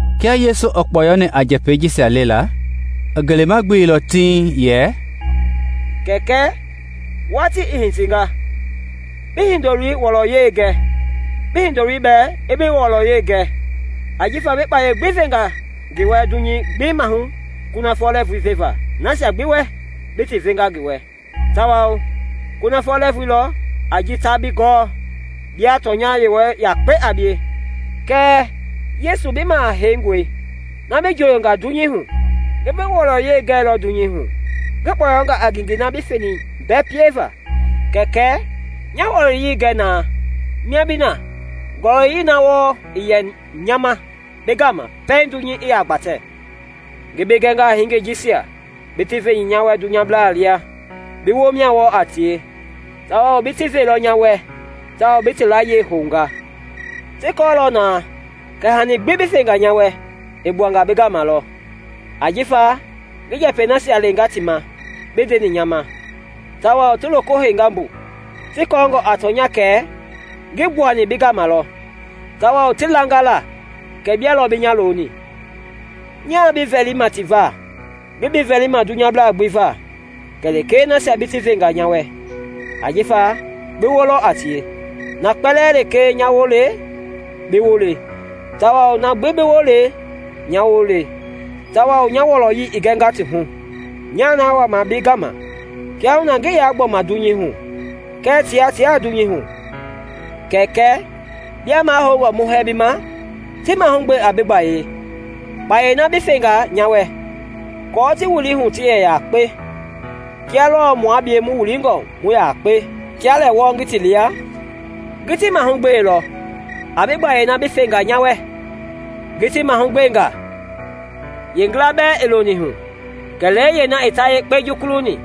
Kia Yesu i kpɔyɔni a njɛpɛi jisia lela, i ngelema gbeilɔ tiŋ yɛ, “Kɛkɛ, watii i hitinga; bi Hindoloi wɔlɔyei gɛ, bi Hindoloi bɛɛ i bi wɔlɔyei gɛ. Ajifa bi kpayei gbi venga ngi wɛ nuuvui gbi maahu kunafɔ lɛɛvui veva nasia gbi wɛ bi ti venga ngi wɛ. Tawao kunafɔ lɛɛvui lɔ a ji ta bi gɔɔ, bia tɔnya Yewɔ yakpei a bie, kɛɛ Yesu bi Maha Heingɔi, na bi njooyonga dunyei hu. Ngi bi wɔlɔyei gɛilɔ dunyei hu ngi kpɔyɔnga a ngengei na bi feni mbɛ pieva. Kɛkɛ, nya wɔlɔyei gɛ na mia bi na, ngɔlɔyɛi na wɔɔ i yɛ nya ma bi gama pɛiŋ dunyei i yaa gbatɛ. “Ngi bi gɛnga a hingei jisia bi ti veni nya wɛ dunyabla lia, bi woo mia wɔɔ a tie, tawao bi ti veilɔ nya wɛ tao ti bi layie hounga. Ti kɔɔlɔ na kɛ hanii gbi bi fenga nya wɛ i gbuanga bi gama lɔ; ajifa ngi njɛpɛi nasia lenga ti ma bi ndeni nya ma, tawao ti loko heinga mbu, ti kɔɔngɔ a tɔnya kɛ ngi gbuani bi gama lɔ; tawao ti langa la kɛ bia lɔ bi nya loni. “Nyaa bi vɛlima ti va; ngii bi vɛlima dunyablaa gbi va kɛlee nasia bi ti venga nya wɛ, ajifa bi woo lɔ a tie. Na kpɛlɛɛ lekee nya woo le bi woo le tawao na bi woo le nya woo le tawao nya wɔlɔyei i gɛnga ti hu. Nya na wama bi gama; kiahuna ngii yaa gbɔma dunyei hu kɛɛ tia tiaa dunyei hu. Kɛkɛ, bia mahoungɔ mu hɛɛ bi ma, ti mahugbe a bi gbayei, kpayei na bi fenga nya wɛ, aako ti wili hu ti yɛ yakpe kia lɔɔ mua bie mu wilingɔ hu mu yakpe. Kia lɛ wɔɔ ngi ti lia, ngi ti mahugbeilɔ a bi gbayei na bi fenga nya wɛ; ngi ti mahugbenga, yeengila bɛɛ ii loni hu kɛlee yeena i ta yekpe jukuluni,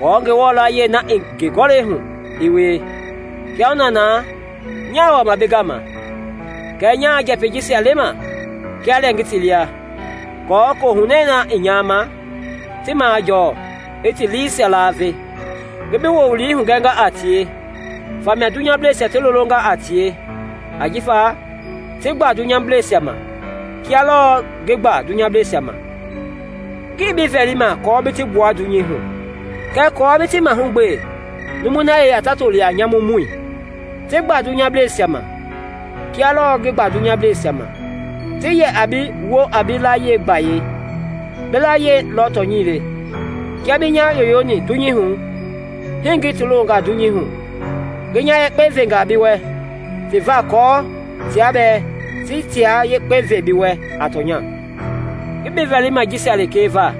aako Ngewɔ layie na i ngi Gɔlɛi hu i wie. Kiahuna na nya wama bi gama; kɛɛ nyaa njɛpɛi jisia lema kia lɛ ngi ti lia aako Kohunɛ na i nya ma, ti majɔɔ i ti liisia laave. Ngi bi wowili hugɛnga a tie, famia dunyableisia ti lolonga a tie, ajifa ti gba dunyableisia ma kia lɔɔ ngi gba dunyableisia ma. Ngii bi vɛlima aako bi ti gbua dunyei hu, kɛɛ aako bi ti mahugbe numui na yeya ta toli a nyamumɔi. Ti gba dunyableisia ma, kia lɔɔ ngi gba dunyableisia ma. Ti yɛ a bi woo a bi layie gbayei; bi layie lɔ tɔnyɛi le. Kia bi nya yoyoni dunyei hu, hii ngi ti longa dunyei hu. Ngi nya yekpe venga bi wɛ ti va aako tia bɛɛ ti tia yekpe ve bi wɛ a tɔnya. “Ngii bi vɛlima jisia lekee va;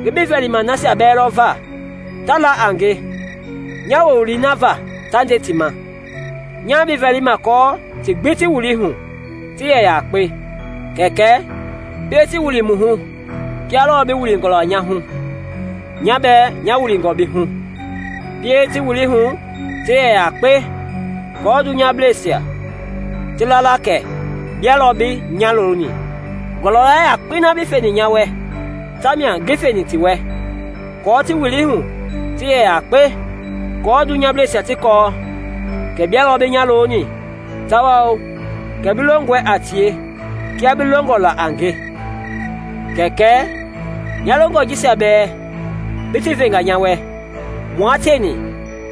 ngi bi vɛlima nasia bɛɛ lɔ va ta la a nge nya wowili na va ta nde ti ma. Nyaa bi vɛlima aako ti gbi ti wili hu ti yɛ yakpe. Kɛkɛ, pie ti wili mu hu kia lɔɔ bi wilingɔ nya hu, nya bɛɛ nya wilingɔ bi hu. Pie ti wili hu ti yɛ yakpe aako dunyableisia ti la la kɛ bia lɔ bi nya loni. Ngɔlɔya yakpei na bi feni nya wɛ ta mia ngi feni ti wɛ aako ti wili hu ti yɛ yakpe, kɔɔ dunyableisia ti kɔɔ kɛ bia lɔ bi nya loni tawao kɛ bi longɔe a tie kia bi longɔ la a nge. “Kɛkɛ, nya longɔ jisia bɛɛ bi ti venga nya wɛ mua tieni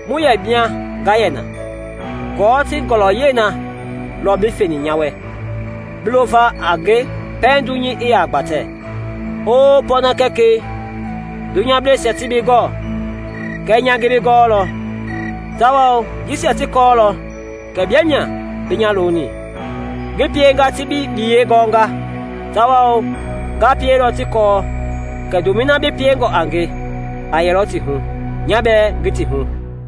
mu yɛ mia nga yɛ na, aako ti ngɔlɔyɛi na lɔ bi feni nya wɛ bi lova a nge pɛiŋ dunyei i yaa gbatɛ. Oo pɔɔna Kɛkɛi, dunyableisia tii bi gɔɔ kɛɛ nya ngi bi gɔɔlɔ, tawao jisia ti kɔɔlɔ kɛ bia mia bi nya loni. Ngi pienga ti bi biyɛi gɔnga, tawao nga pielɔ ti kɔɔ kɛ ndomɛi na bi piengɔ a nge a yɛlɔ ti hu, nya bɛɛ ngi ti hu.”